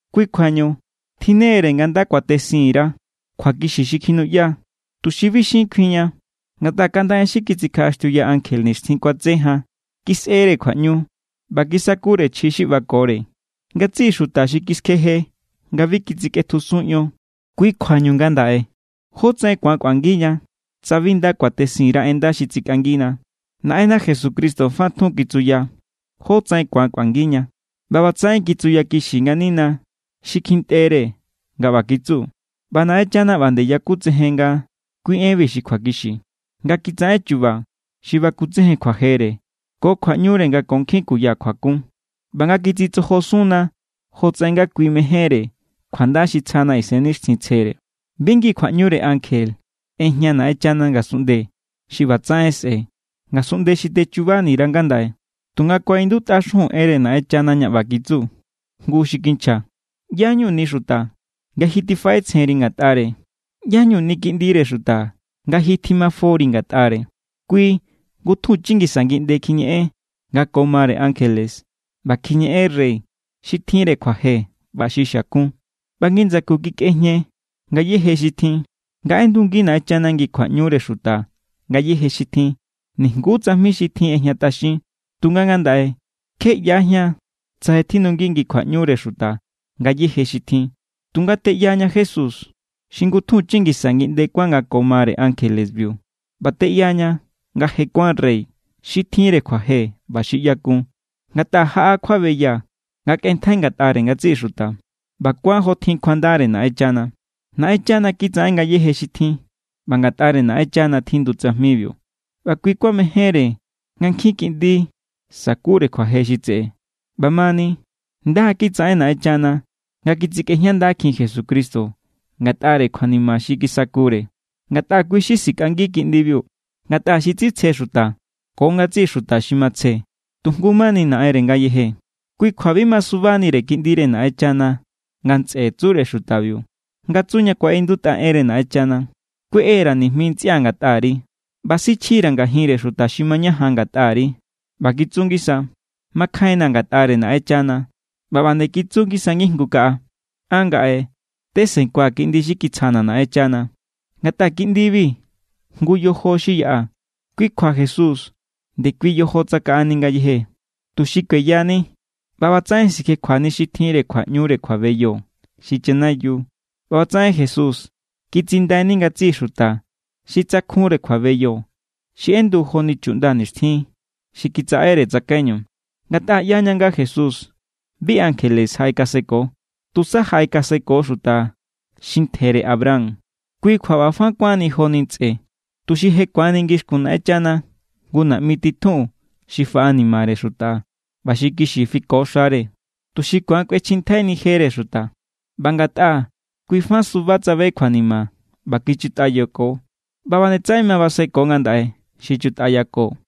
Kui kjuañu tjinnere nga nda kuatesinni_ra kjuakixi xi kjinuꞌya, tuxi bi xin kjuinña. Ngatꞌa kaꞌnda en xi kitsikjaꞌaxtiuya ankje nixtjin kuatse jan kisꞌere kjuaꞌñu, ꞌba kisakure chji xi ꞌbakore ngatsiꞌi xuta xi kiskjeje nga bi kitsikꞌetjusun ion. Kui= kjuañu ngandaꞌe, ¿jótsaꞌen ku̱an kꞌuangiña tsa bi nda kuatesin_ra en nda xi tsikꞌangina? Naꞌenna Jesucristo fa tjun kitsuya jótsaꞌen ku̱an kꞌuangiña, ꞌba ꞌbatsaꞌen kitsuyakixi nganina xi kjintꞌere nga ꞌba kitsu. ꞌBa Naꞌenchana ꞌba nde yakutsejen nga kui enbi xi kjuakixi, nga kitsaꞌen chu̱ba̱ xi bakutsejen kjuajere ko kjuaꞌñure nga ko nkjin kuya kjuakun, ꞌba nga kitsitsojosunna jotsaꞌen nga kui mejénre kjuanda xi tsjana Isennixtjintsjere. Bi ngi kjuaꞌñure ankje ꞌejña Naꞌenchana ngasunꞌnde xi ꞌbatsaꞌen sꞌe̱, ngasunꞌnde xi techubani_ra ngandaꞌe. Tunga kuaꞌindutꞌa xujun enre Naꞌenchana ña ꞌba kitsu jngu xi kinchja: ¿ꞌYá=ñuni xuta nga ji tifaꞌetsjenri ngatꞌare? ¿ꞌYá=ñuni kiꞌndire xuta nga ji tjimafori ngatꞌare? Kui ngutjunchi ngisa ngiꞌnde kjiñeꞌen nga ko mare ankjelebiu, ꞌba kjiñeꞌen rey xi tjinre kjuaje ꞌba xi xiakun, ꞌba ngi ndsaku kikꞌejña ngayéje xi tjin. Nga ꞌendungi Naꞌenchana ngi kjuaꞌñure xuta ngayéje xi tjin, nijnguú tsajmi xi tjin ꞌejñatꞌaxin. Tunga ngandaꞌe kje ꞌyajían tsa je tjindungi ngi kjuaꞌñure xuta ngayéje xi tjin. Tunga teꞌyaña Jesús xi ngutjunchi ngisa ngiꞌnde kuán nga ko mare ankjelebiu. ꞌBa teꞌyaña nga je kuán rey xi tjinre kjuaje ꞌba xi ꞌyakun, ngatꞌa jaꞌa kjuabeya nga kꞌenntjai ngatꞌare ngatsiꞌi xuta. ꞌBa kuán jo tjin kjuandare Naꞌenchana. Naꞌenchana kitsaꞌen ngayéje xi tjin ꞌba ngatꞌare Naꞌenchana tjindu tsajmibiu, ꞌba kui kuamejénre nga nkjin kiꞌndi sa̱kure kjuaje xi tseꞌe. ꞌBamani, nda= kitsaꞌen Naꞌenchana nga kisꞌejñandakjin Jesucristo ngatꞌare kjuanima xi kisakure, ngatꞌa kui xi sikꞌangi kiꞌndibiu. Ngatꞌa xi tsitsje xuta ko ngatsiꞌi xuta xi matsje, tu jngu mani Naꞌenre ngayeje. Kui kjua bi masubanire Kiꞌndire Naꞌenchana nga ntsꞌe tsure xutabiu. Nga tsu ña kuaꞌindutꞌa enre Naꞌenchana: Kueꞌe_ra̱ nijmi ntsꞌia̱ ngatꞌari, ꞌba sichjira̱ ngajinre xuta xi mañajan ngatꞌari. ꞌBa kitsu ngisa: Makjainna̱ ngatꞌare Naꞌenchana. ꞌBa ꞌba nde kitsu ngisa ngijngu kaꞌa: An ngaꞌe, tesenkua̱ kiꞌndi xi kitsjana̱ Naꞌenchana. Ngatꞌa kiꞌndibi jngu yojo xi yaꞌa, kui kjua Jesús ndekui yojo tsakaꞌani ngayeje, tuxi kueyani ꞌba ꞌbatsaꞌen sikjekjuani xi tjinre kjuaꞌñure kjuabeyo, xi chanayiu. ꞌBa ꞌbatsaꞌen Jesús kitsindaini ngatsiꞌi xuta xi tsakjunre kjuabeyo xi ꞌendu joni chuꞌnda nixtjin xi kitsaꞌere tsakaiñu. Ngatꞌa ꞌyaña nga Jesús bi ankjele jaꞌekaseko. Tusa jaꞌekaseko xuta xi ntjere Abraham. Kui kjua ꞌba fa kuánni joni ntsꞌe, tuxi je ku̱anni ngixkun Naꞌenchana jngu naꞌmi titjun xi faꞌanimare xuta ꞌba xi kixi fiko xare, tuxi ku̱an kꞌuechjintjaini jere xuta. ꞌBa ngatꞌa kui fa suba tsabe kjuanima ꞌba kichutꞌayako, ꞌba nde tsaꞌen ma baseko ngandaꞌe xi chutꞌayako.